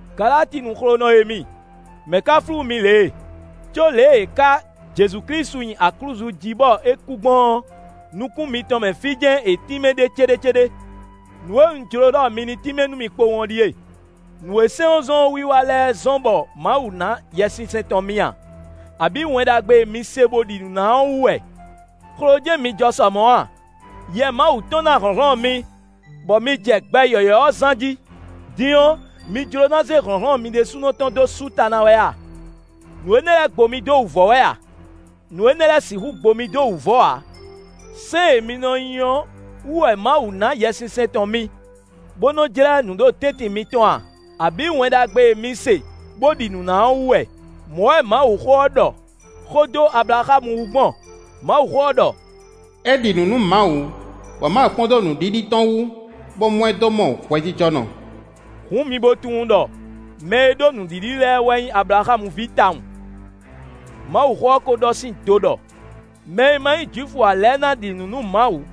Galatinu xlonɔ e mi! Mɛ̌ ka flú mi lě e? Có lě e è ká Jezu Klísu nyi aklúzu jí bɔ é kú gbɔn ɔ́, nukún mitɔn mɛ fí jɛ́n è tínmɛ ɖe céɖécéɖé. Nǔ e un jló ɖɔ mi ní tínmɛ nú mì kpowun ɔ́ ɖíe: nǔ e sɛ́n ɔ́ zɔ́n wiwa lɛ́ɛ wɛ zɔ́n bɔ Mawu ná Yɛsinsɛn tɔn mi a, abǐ Wɛn Ɖagbe e mi se bó ɖi nǔ ná ɔ́ wú wɛ? Xlo jɛ́n mi jɔ sɔ mɔ̌ a? Yɛ Mawu tɔn ná hlɔ̌nhlɔ́n mi, bɔ mi jɛ gbɛ yɔ̌yɔ́ ɔ́ zán jí. Din ɔ́, mi jló ná zé hlɔ̌nhlɔ́n mi ɖésúnɔ tɔn dó sú ta ná wɛ a? Nǔ énɛ́ lɛ́ɛ gbo mi dó wǔvɔ́ wɛ a? Nǔ énɛ́ lɛ́ɛ sixú gbo mi dó wǔvɔ́ ǎ. Sɛ́n e mi nɔ nyi ɔ́ wú wɛ Mawu ná Yɛsinsɛn tɔn mi, bó nɔ jlɛ́ nǔ ɖo tɛ́ntin mitɔn a, abǐ Wɛn Ɖagbe e mi se bo ɖi nǔ ná ɔ́ wú wɛ? Mɔ̌ wɛ Mawuxó ɔ́ ɖɔ xó dó Ablaxámu wú gbɔn; Mawuxó ɔ́ ɖɔ: “É ɖi nǔ nú Mawu, bɔ Mawu kpɔ́n dó nǔɖiɖi tɔn wú, bó mɔ ɛ dó mɔ hwɛjijɔnɔ.” Hǔn mi bo tunwun ɖɔ mɛ e ɖó nǔɖiɖi lɛ́ɛ wɛ nyí Ablaxámu ví tawun. Mawuxó ɔ́ ko ɖɔ sín do ɖɔ: mɛ e ma nyí Jwifu ǎ lɛ́ɛ ná ɖi nǔ nú Mawu,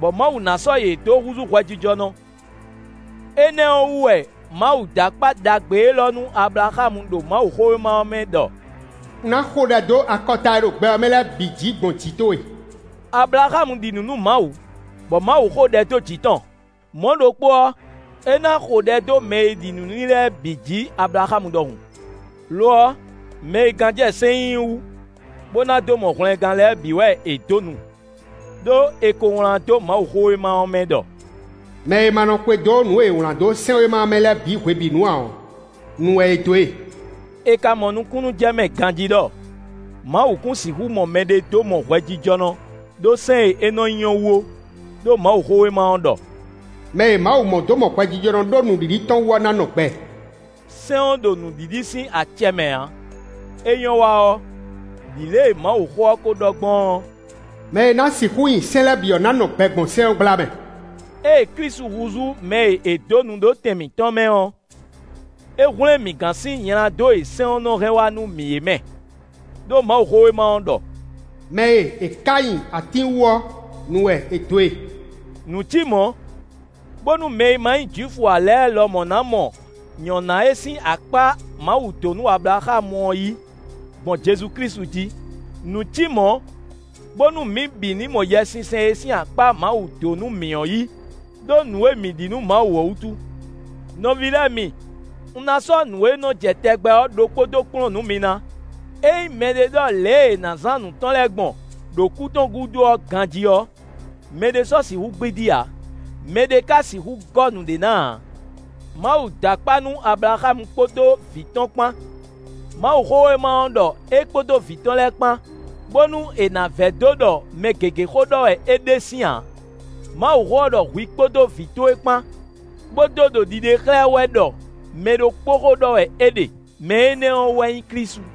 bɔ Mawu ná sɔ́ yě dó húzú hwɛjijɔnɔ; énɛ́ ɔ́ wú wɛ Mawu dó akpá ɖagbe élɔ́ nú Ablaxámu ɖo Mawuxówéma ɔ́ mɛ ɖɔ: “Un ná xo ɖɛ dó akɔta e ɖo gbɛ ɔ́ mɛ lɛ́ɛ bǐ jǐ gbɔn jǐ towe.” Ablaxámu ɖi nǔ nú Mawu, bɔ Mawu xo ɖɛ dó jǐ tɔn; mɔ̌ ɖokpó ɔ́, é ná xo ɖɛ dó mɛ e ɖi nǔ n'i lɛ́ɛ bǐ jǐ, Ablaxámu ɖɔhun. Lo ɔ́, mɛ e gán jɛ sɛ́n nyinyi wú, bó ná dó mɔ hwlɛngán lɛ́ɛ bǐ wɛ è dó nu. Đó è ko wlán dó Mawuxówéma ɔ́ mɛ ɖɔ: “Mɛ e ma nɔ xwedó nǔ e è wlǎn dó sɛ́nwéma ɔ́ mɛ lɛ́ɛ bǐ hwebǐnu ǎ ɔ́, nu wɛ è dó e.” È ka mɔ nukúnnú jɛ mɛ ganjí ɖɔ Mawu kún sixú mɔ mɛɖé dó mɔ hwɛjijɔnɔ ɖó sɛ́n e é nɔ nyi ɔ́ wú ó; ɖó Mawuxówéma ɔ́ ɖɔ: “Mɛ e Mawu mɔ dó mɔ hwɛjijɔnɔ ɖó nǔɖiɖi tɔn wú ɔ́ ná nɔ gbɛ.” Sɛ́n ɔ́ ɖo nǔɖiɖi sín acɛ mɛ ǎ; é nyɔ́ wa ɔ́, ɖi lě e Mawuxó ɔ́ ko ɖɔ gbɔn ɔ́: “Mɛ e ná sixú nyi sɛ́n lɛ́ɛ bǐ ɔ́ ná nɔ gbɛ gbɔn sɛ́n ɔ́ gbla mɛ.” Ée Klísu húzú mɛ e è dó nu ɖó tɛn mǐtɔn mɛ ɔ́, é hwlɛ́n mǐ gán sín nyladó e sɛ́n ɔ́ nɔ hɛn wá nú mǐ é mɛ; ɖó Mawuxówéma ɔ́ ɖɔ: “Mɛ e è ká nyi atín wú ɔ́, nu wɛ è dǒ e.” Nǔ cí mɔ̌, bónú mɛ e ma nyí Jwifu ǎ lɛ́ɛ lɔ ná mɔ nyɔ̌ná e sín akpá Mawu dó nú Ablaxámu ɔ́ yí gbɔn Jezu Klísu jí. Nǔ cí mɔ̌, bónú mǐ bǐ ní mɔ Yɛsinsɛn e sín akpá Mawu dó nú mǐ ɔ́ yí ɖó nǔ e mǐ ɖi nú Mawu ɔ́ wútu. Nɔví lɛ́ɛ mi, un ná sɔ́ nǔ e nɔ jɛ tɛgbɛ ɔ́ ɖokpó dó kplɔ́n nǔ mi ná. Ényí mɛɖé ɖɔ lě e è nǎ zán nǔ tɔn lɛ́ɛ gbɔn ɖo kú tɔn gúdo ɔ́ ganjí ɔ́, mɛɖé sɔ́ sixú gbídí ǎ; mɛɖé ka sixú gɔ́ nǔɖé ná ǎ. Mawu dó akpá nú Ablaxámu kpódó vǐ tɔn kpán. Mawuxówéma ɔ́ ɖɔ é kpódó vǐ tɔn lɛ́ɛ kpán, bónú è nǎ vɛdó ɖɔ mɛ gěgé xó ɖɔ wɛ é ɖe sín ǎ. Mawuxó ɔ́ ɖɔ hwi kpódó vǐ towe kpán, bó dó ɖo ɖiɖe xlɛ́ wɛ ɖɔ mɛ ɖokpó xó ɖɔ wɛ é ɖe; mɛ énɛ́ ɔ́ wɛ nyí Klísu.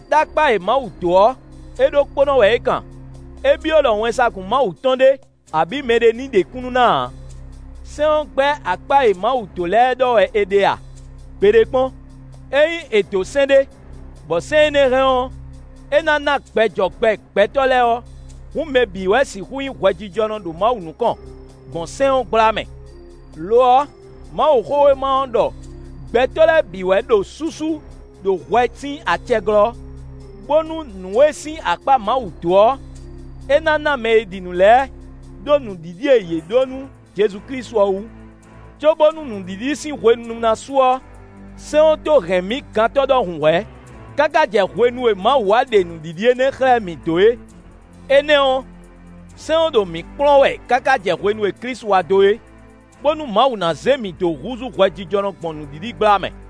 Đó akpá e Mawu dó ɔ́, é ɖokpónɔ wɛ é kan; é byɔ́ ɖɔ wɛnsagun Mawu tɔn ɖé, abǐ mɛɖé ní ɖe kúnnu ná ǎ. Sɛ́n ɔ́ gbɛ́ akpá e Mawu dó lɛ́ɛ ɖɔ wɛ è ɖe a? Gbeɖé kpɔ́n. Ényí è dǒ sɛ́n ɖé, bɔ sɛ́n énɛ́ hɛn ɔ́, é ná ná gbɛ jɔ gbɛ gbɛtɔ́ lɛ́ɛ ɔ́, hǔn mɛ bǐ wɛ sixú nyí hwɛjijɔnɔ ɖo Mawu nukɔn, gbɔn sɛ́n ɔ́ gbla mɛ. Lo ɔ́, Mawuxówéma ɔ́ ɖɔ gbɛtɔ́ lɛ́ɛ bǐ wɛ ɖo súsú ɖo hwɛ sín acɛ glɔ́, bónú nǔ e sín akpá Mawu dó ɔ́, é ná ná mɛ e ɖi nǔ lɛ́ɛ, ɖó nǔɖiɖi e yě ɖǒ nú Jezu Klísu ɔ́ wú. Cóbónú nǔɖiɖi sín hwenu ná su ɔ́, sɛ́n ɔ́ tó hɛn mǐ gantɔ́ ɖɔhun hwɛ̌, káká jɛ hwenu e Mawu wá ɖe nǔɖiɖi énɛ́ xlɛ́ mǐ dó é. Énɛ́ ɔ́, sɛ́n ɔ́ ɖo mǐ kplɔ́n wɛ káká jɛ hwenu e Klísu wá dó é, bónú Mawu ná zé mǐ dó húzú hwɛjijɔnɔ gbɔn nǔɖiɖi gbla mɛ.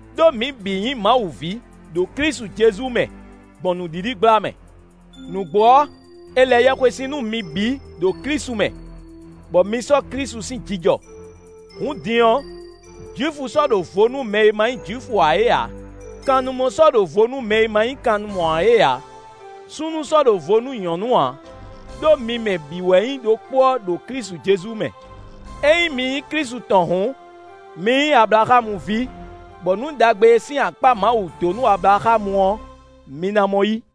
ɖó mi bǐ nyí Mawu ví, ɖo Klísu Jezu mɛ, gbɔn nǔɖiɖi gbla mɛ. Nǔgbó ɔ́, è lɛ yɛhwesin nú mi bǐ ɖo Klísu mɛ, bɔ mi sɔ́ Klísu sín jijɔ. Hǔn din ɔ́, Jwifu sɔ́ ɖo vo nú mɛ e ma nyí Jwifu ǎ é ǎ; kannumɔ sɔ́ ɖo vo nú mɛ e ma nyí kannumɔ ǎ é ǎ; súnnu sɔ́ ɖo vo nú nyɔ̌nu ǎ; ɖó mi mɛ bǐ wɛ nyí ɖokpó ɔ́ ɖo Klísu Jezu mɛ. Ényí mi nyí Klísu tɔn hǔn, mi nyí Ablaxámu ví, bɔ nǔ ɖagbe e sín akpá Mawu dó nú Ablaxámu ɔ́, mi ná mɔ yí.